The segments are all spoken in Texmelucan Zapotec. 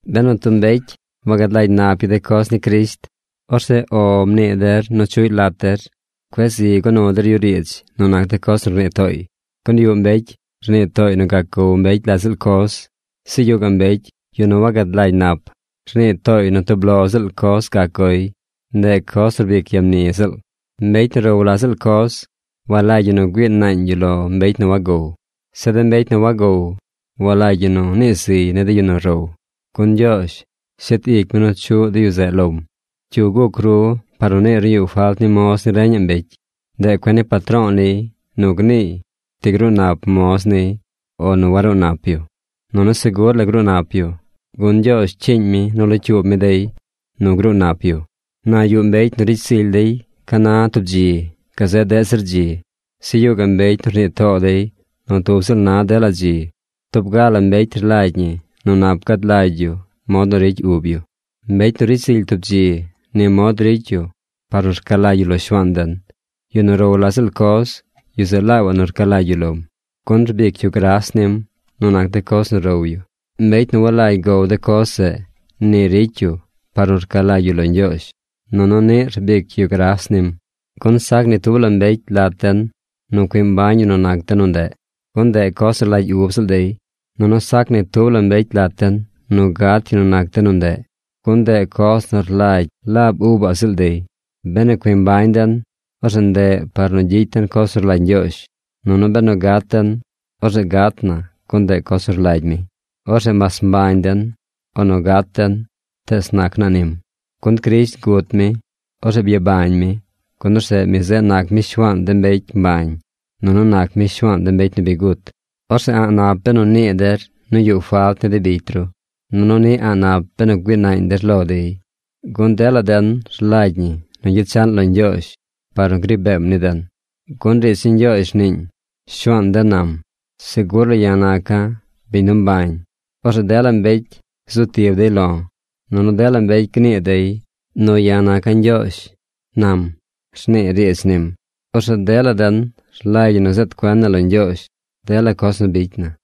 Benu tub mbecy wagad lagy nap yu de coz ni Crisht, orzeꞌ “O” mnii der nu chuꞌy lat der. Cueꞌ zi go nu der yu riidz nu nac de coz nu rnii tooy. Gun yuꞌ mbecy, rnii tooy nu gac gow mbecy la ziꞌl coz. Zeꞌ yuꞌ gaꞌ mbecy, yu nu wagad lagy nap, rnii tooy nu tub lo ziꞌl coz gac goy, ndeꞌ coz nu rbic ya mni ziꞌl. Mbecy nu row la ziꞌl coz, walagy ñi nu güii naañ yu lo mbecy nu wagow. Zeꞌ de mbecy nu wagow, walagy ñi nu nii ziy ni de yu nu row, gun Ñgyoozh shet ic mi nu chuꞌ de yu zeꞌ lom. ¿Cyu guc ru par nu niir nu yuꞌ falt ni moz ni reñaꞌ mbecy? Ndeꞌ cuen ni patro̱o̱ niy nu gniiy ti gruu nap moz niy o nu waruu nap yu. Nunu segur la gruu nap yu, gun Ñgyoozh cyiiñ mi nu locyuub mi dey nu gruu nap yu. Na yuꞌ mbecy nu ricy zily zir dey ca na tub dzi gazeꞌ deꞌ zir dzi. Zeꞌ yuꞌ gaꞌ mbecy nu rnii too dey nu tub ziꞌl na dela dzi. Tub ga la mbecy rlagy ñi nu nap gad lagy yu mod nu ricy ub yu. Mbecy nu ricy zily tub dzi, ni mod ricy yu par nu rca lagy yu lo Shuaan den. Yu nu row la ziꞌl coz, yu zeꞌ laabaꞌ nu rca lagy yu lom, gun rbic yu gras nim nu nac de coz nu row yu. Mbecy nu walagy gow de coz zeꞌ, ni ricy yu par nu rca lagy yu lo Ñgyoozh, nunu niꞌ rbic yu gras nim. Gun sac ni tub la mbecy lat den nu cui mbañ yu nu nac de nu ndeꞌ, gun ndeꞌ coz nu rlagy ub ziꞌl dey. Nunu sac ni tub mbecy lat den nu gat yu nu nac de nu ndeꞌ, gun ndeꞌ coz nu rlagy laab ubaꞌ ziꞌl dey. Benu cui mbañ den, orzeꞌ ndeꞌ par nu gyicy den coz nu rlagy Ñgyoozh. Nunu benu gat den, orzeꞌ gat na gun ndeꞌ coz nu rlagy mi. Orzeꞌ mas mbañ den o nu gat den, tees nac naa nim. Gun Crisht gut mi. Orzeꞌ byabañ mi, gun orzeꞌ mi zeꞌ nac mi Shuaan de mbecy mbañ nunu nac mi Shuaan de mbecy nu bi gut. Orzeꞌ a̱ꞌ nap benu nii der nu yuꞌ falt ni de bicy ru. Nunu niꞌ a̱ꞌ nap benu güii naañ der lo dey. Gun dela den rlagy ñi nu gyechaꞌn lo Ñgyoozh par nu gri beem ni den. Gun riidz ni Ñgyoozh rniiñ: “Shuaan den nam, segur la ya̱ naca̱ biñ nu mbañ. Orzeꞌ dela mbecy zu tib dey lo̱, nunu dela mbecy gnii dey nu ya̱ naca̱ Ñgyoozh, nam”, rnii riidz nim. Orzeꞌ dela den rlagy ñi nu zeed cuen na lo Ñgyoozh dela coz nu bicy na.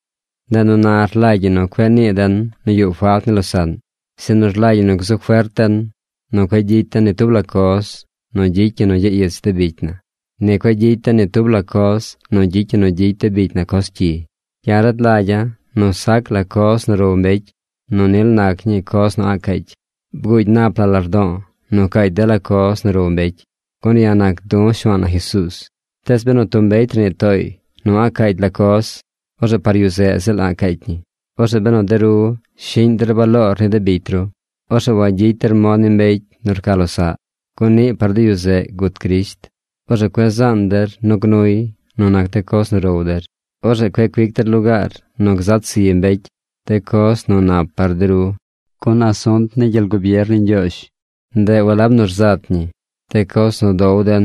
Ndeꞌ nu na rlagy ñi nu cueꞌ nii den nu yuꞌ falt ni losaꞌn, sinu rlagy ñi nu gzu fert den nu cueꞌ gyicy den ni tub la coz nu gyicy ñi nu gyaꞌ ich de bicy na, ni cueꞌ gyicy den ni tub la coz nu gyicy ñi nu gyicy de bicy na coz cyi. Ya̱ rad lagya̱ nu sac la coz nu row mbecy nu nil nac ñii coz nu a̱ꞌ caacy. Bguugy nap la lardo̱o̱ nu caacy dela coz nu row mbecy, gun ya̱ nac du̱ Shuaan na Jesuuz. Tees benu tub mbecy rnii tooy nu a̱ꞌ caacy la coz, orzeꞌ par yu zeꞌ ziꞌl a̱ꞌ caacy ñi. Orzeꞌ benu de ru shiꞌñ der baloor ni de bicy ru, orzeꞌ wagyicy der mod ni mbecy nu rca losaꞌ, gun niꞌ par de yu zeꞌ gut Crisht. Orzeꞌ cueꞌ zaan der nu gnuy nu nac de coz nu row der. Orzeꞌ cueꞌ cuic der lugaar nu gzat zi mbecy de coz nu nap par de ru. Gun asunt ni gyel gubier ni Ñgyoozh, ndeꞌ walab nu rzat ñi de coz nu dow den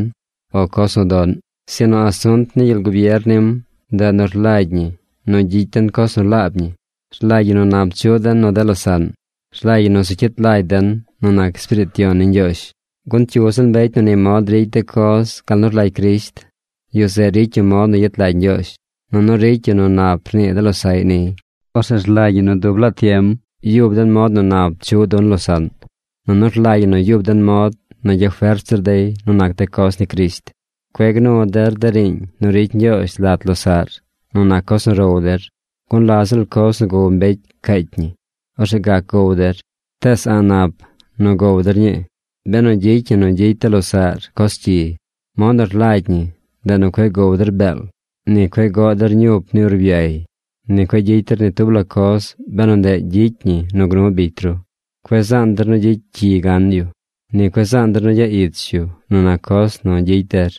o coz nu doꞌn, sinu asunt ni gyel gubier nim, ndeꞌ nu rlagy ñi nu gyicy den coz nu laab ñi. Rlagy ñi nu nap chuꞌ den nu de losaꞌn. Rlagy ñi nu zu cyit lagy den nu nac Espiriit Yon ni Ñgyoozh. Gun cyu ziꞌl mbecy nu ni mod ricy de coz gal nu rlagy Crisht, yu zeꞌ ricy yu mod nu yet lagy Ñgyoozh. Nunu ricy yu nu nap rnii de losaꞌy niy. Orzeꞌ rlagy ñi nu dub laa tiem yub den mod nu nap chuꞌ dun losaꞌn, nunu rlagy ñi nu yub den mod nu gyafert zir dey nu nac de coz ni Crisht. Cueꞌ gnu der de riiñ nu ricy Ñgyoozh lat losaꞌr nu nac coz nu row der, gun la ziꞌl coz nu gow mbecy caacy ñi. Orzeꞌ gac gow der, tees a̱ꞌ nap nu gow der ñii, benu gyicy ñi nu gyicy de losaꞌr coz cyi. Mod nu rlagy ñi, ndeꞌ nu cueꞌ gow der beel, ni cueꞌ goꞌ der ñup ni urbyay, ni cueꞌ gyicy der ni tub la coz benu ndeꞌ gyicy ñi nu gnu bicy ru. (Cueꞌ zaan der nu gyicy cyi gan yu. Ni cueꞌ zaan der nu gyaꞌ ich yu nu nac coz nu gyicy der.)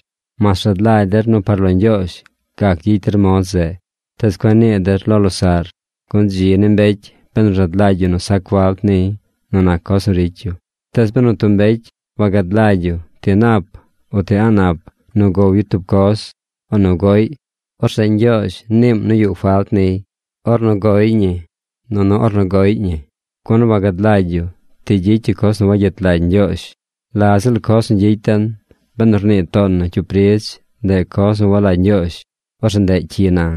Mas rad lagy der nu par lo Ñgyoozh gac gyicy der mod zeꞌ, tees cueꞌ nii der lo losaꞌr. ¡Gun dzi ni mbecy benu rad lagy yu nu sac falt niy nu nac coz nu ricy yu! Tees benu tub mbecy wagad lagy yu ti nap uti a̱ꞌ nap nu gow yu tub coz, o nu goꞌy, orzeꞌ Ñgyoozh niim nu yuꞌ falt niy ornu goy ñi nunu ornu goꞌy ñi, gun wagad lagy yu ti gyicy yu coz nu wayet lagy Ñgyoozh. La ziꞌl coz nu gyicy den, benu rnii toon nu cyup ridz ndeꞌ coz nu walagy Ñgyoozh, orzeꞌ ndeꞌ cyi na.